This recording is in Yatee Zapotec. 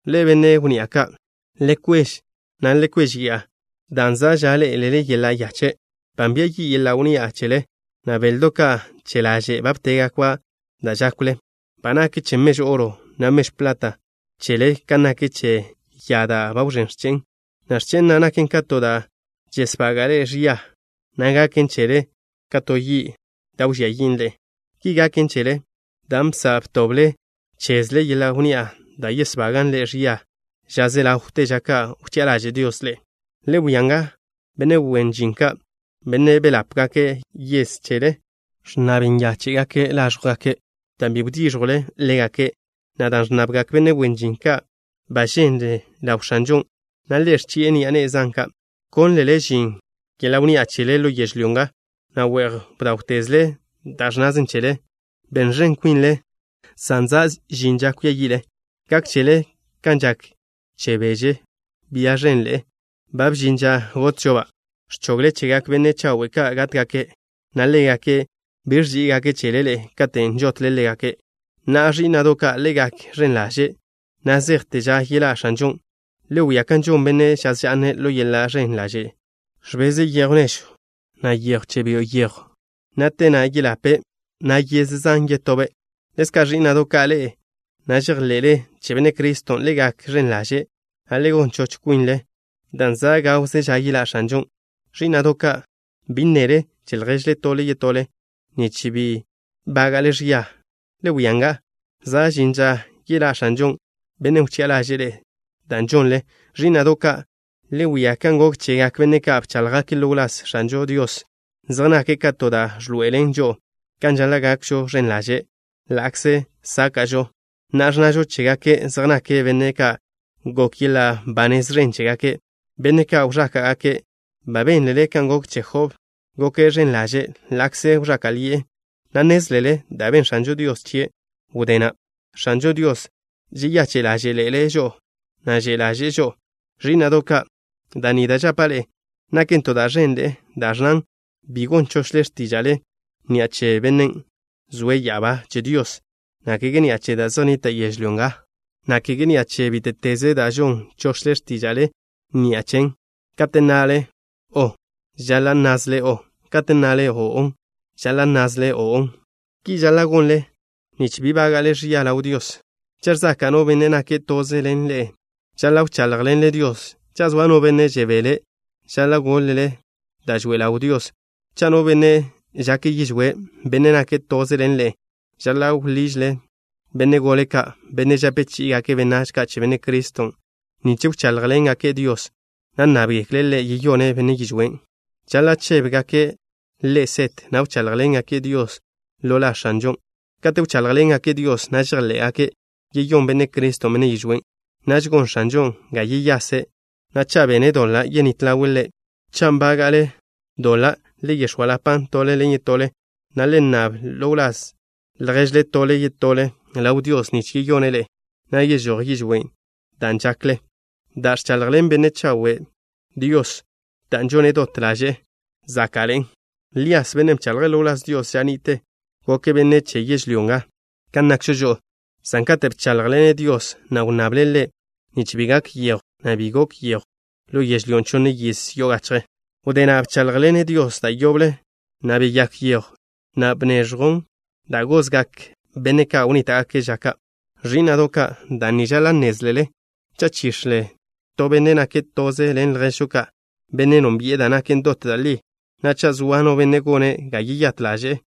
Ḻe'e, benne' wnni'a ka', le kwež, na' le kwéžeya'a, dan' za' ža ḻé'elele yeḻa' yache'. Ba nbia yi' yeḻa' wnni'a chele, na' beldo' ka' che laže' ba btégakba' da' žákwle. Ba nak che mežw oro, na' mežw plat chele kan nak che ya da' ba wẕén x̱che'en, na' x̱che'e na' naken ka to da' žesbaga' ḻe'e ẕia, na' gaken chele ka to yi' da' wžía yin' ḻe'e. Ki gaken chele dan' bsa' btoble chezle yeḻa' wnni'a da' yesbagan' ḻe'e ẕia ža ze ḻawte ža kate' wchi'a ḻaže' Dios ḻe'e. Le wia nga. Benne' wen žin ka', benne' beḻápgake' yez chele, ẕnnab yóžgekle' láẕjwgake' dan' bi wdíẕjwle ḻégake', na' dan' ẕnnabgak benne' wen žin ka' ba ženlen ḻaw X̱anžon', na' Ḻe' ẕchi'e ni'a ne'e zan ka'. Bkónlele žin yeḻa' wnni'a chele ḻo yežlyó nga, na' we'j bdáwtezle da' ẕnnaze chele. Ben ẕen kwinle, san za' žin ža kwia yi'le. Gak chele kan žak che beže, bia ženne', ba bžin ža gotžo-ba'. Ẕchogle chegak benne' chawe' ka' gátgake', na' ḻégake' bi ẕží'igake' chele ḻe'e katen' žotle ḻégake'. Na'a, ẕí'na'do' ka', le gak ẕen ḻaže' na' zejte ža yeḻá' X̱anžon'. Le wia kan žon benne' žaz ža'ne'. Ḻo yeḻa' ẕen ḻaže' ẕbeze' yéjwsio', na' yejw che byo' yejw, na' te na' yeḻape', na' yez zan yetobe'. Ḻezka', ẕí'na'do' ka', ḻe'e na' žejḻe'le che Benne' Criston', le gak ẕen ḻaže', na' le gon choch kwinle, dan' za' gawze ža yeḻá' X̱anžon'. Ẕí'na'do' ka', bi nnele che lježle tole yetole, nich bi bága'le ẕia. Le wia nga. Za' žin ža yeḻá' X̱anžon', Bennen' wchi'a ḻaže'e da' žonle. Ẕí'na'do' ka', le wia kan gok chegak benne' ka' bcháḻjgake' ḻo wláz X̱anžo Dios. Zej nake' ka to da' ẕḻoe'elen žo'o kan žaḻa' gakžo ẕen ḻaže' ḻa'kze sáka'žo. Na'a, ẕnnažo chégake' zej nake' benne' ka' gok yeḻa' ba nez ẕen chégake', benne' ka' wẕáka'gake'. Ba bénlele kan gok che Job. Goke' ẕen ḻaže' ḻa'kze wẕáka'ḻi'e, na' nnézlele da' ben X̱anžo Dios chie' wdé na'. X̱anžo Dios žeyache' ḻáže'ḻe'ele' žo'o, na' že' ḻaže'e žo'o. Ẕí'na'do' ka', da' ni da' žapa' ḻe'e naken to da' ẕenḻe'en, da' ẕnnan: bi gon chochle x̱tíža'le ni'a che Bennen' zoe' ya'abá che Dios, na' kege ni'a che da' zej nnita' yežlyó nga, na' kege ni'a che bíte'teze da' žon chochle x̱tíža'le ni'a chen. Kate' nnale: “o'” žaḻa' nnázele: “o'.” Kate' nnale: “o'o” žaḻa' nnázele: “o'o.” Ki žaḻa' gonle, nich bi bága'le ẕia ḻaw Dios. Cha' ẕzaka' no benne' nake' toze ḻen ḻe'e, žaḻa' wcháḻjḻene' Dios. Cha' zoa no benne' žebele', žaḻa' goḻe' da' žoe ḻawn Dios. Cha' no benne' žake' yižwé', benne' nake' toze ḻen ḻe'e, žaḻa' wḻiže' benne' gole ka', benne' žape chí'igake' benách ka' che Benne' Criston', nich wcháḻjḻengake' Dios, na' nnábgekle' Ḻe' yeyone' benne' yižwén'. Žaḻa' chébgake' ḻe' set, na' wcháḻjḻengake' Dios ḻo la X̱anžon'. Kate' wcháḻjḻengake' Dios, na' žejḻé'gake' yeyón Benne' Criston' benne' yižwén', naž gon X̱anžon' ga yeyase', na' cha' bene' doḻa', yenít ḻawe' ḻe'. Che ḻen, cha' nbága'le doḻa' le yex̱óalapan' tole ḻen yetole, na' le nnab ḻo wláz lježle tole yetole ḻaw Dios nich yeyone' ḻe'e, na' yežój yižwén' da' žakle. Da' ẕchaḻjḻen benne' chawe' Dios, dan' žone' dot ḻaže'e, záka'ḻe'en. Lías, bennen' bchaḻje' ḻo wláz Dios ža ni'te, goke' benne' che yežlyó nga kan nakžo žo'o, san katen' bcháḻjḻene' Dios, na' wnnable' Ḻe' nich bi gak yejw, na' bi gok yejw ḻo yežlyón' chonne yiz yo'o gachje. Wdé na' bcháḻjḻene' Dios da' yoble, na' beyák yejw, na' bneẕjw da' gozgak benne' ka' wnníta'gake' ža ka'. Ẕí'na'do' ka', da' ni žaḻa' nnézlele. Cha' chix̱le to benne' nake' toze ḻen lježžo ka', benne' nónbi'e da' naken dot da' li, na' cha' zoa no benne' gone' ga yeyát ḻaže'e,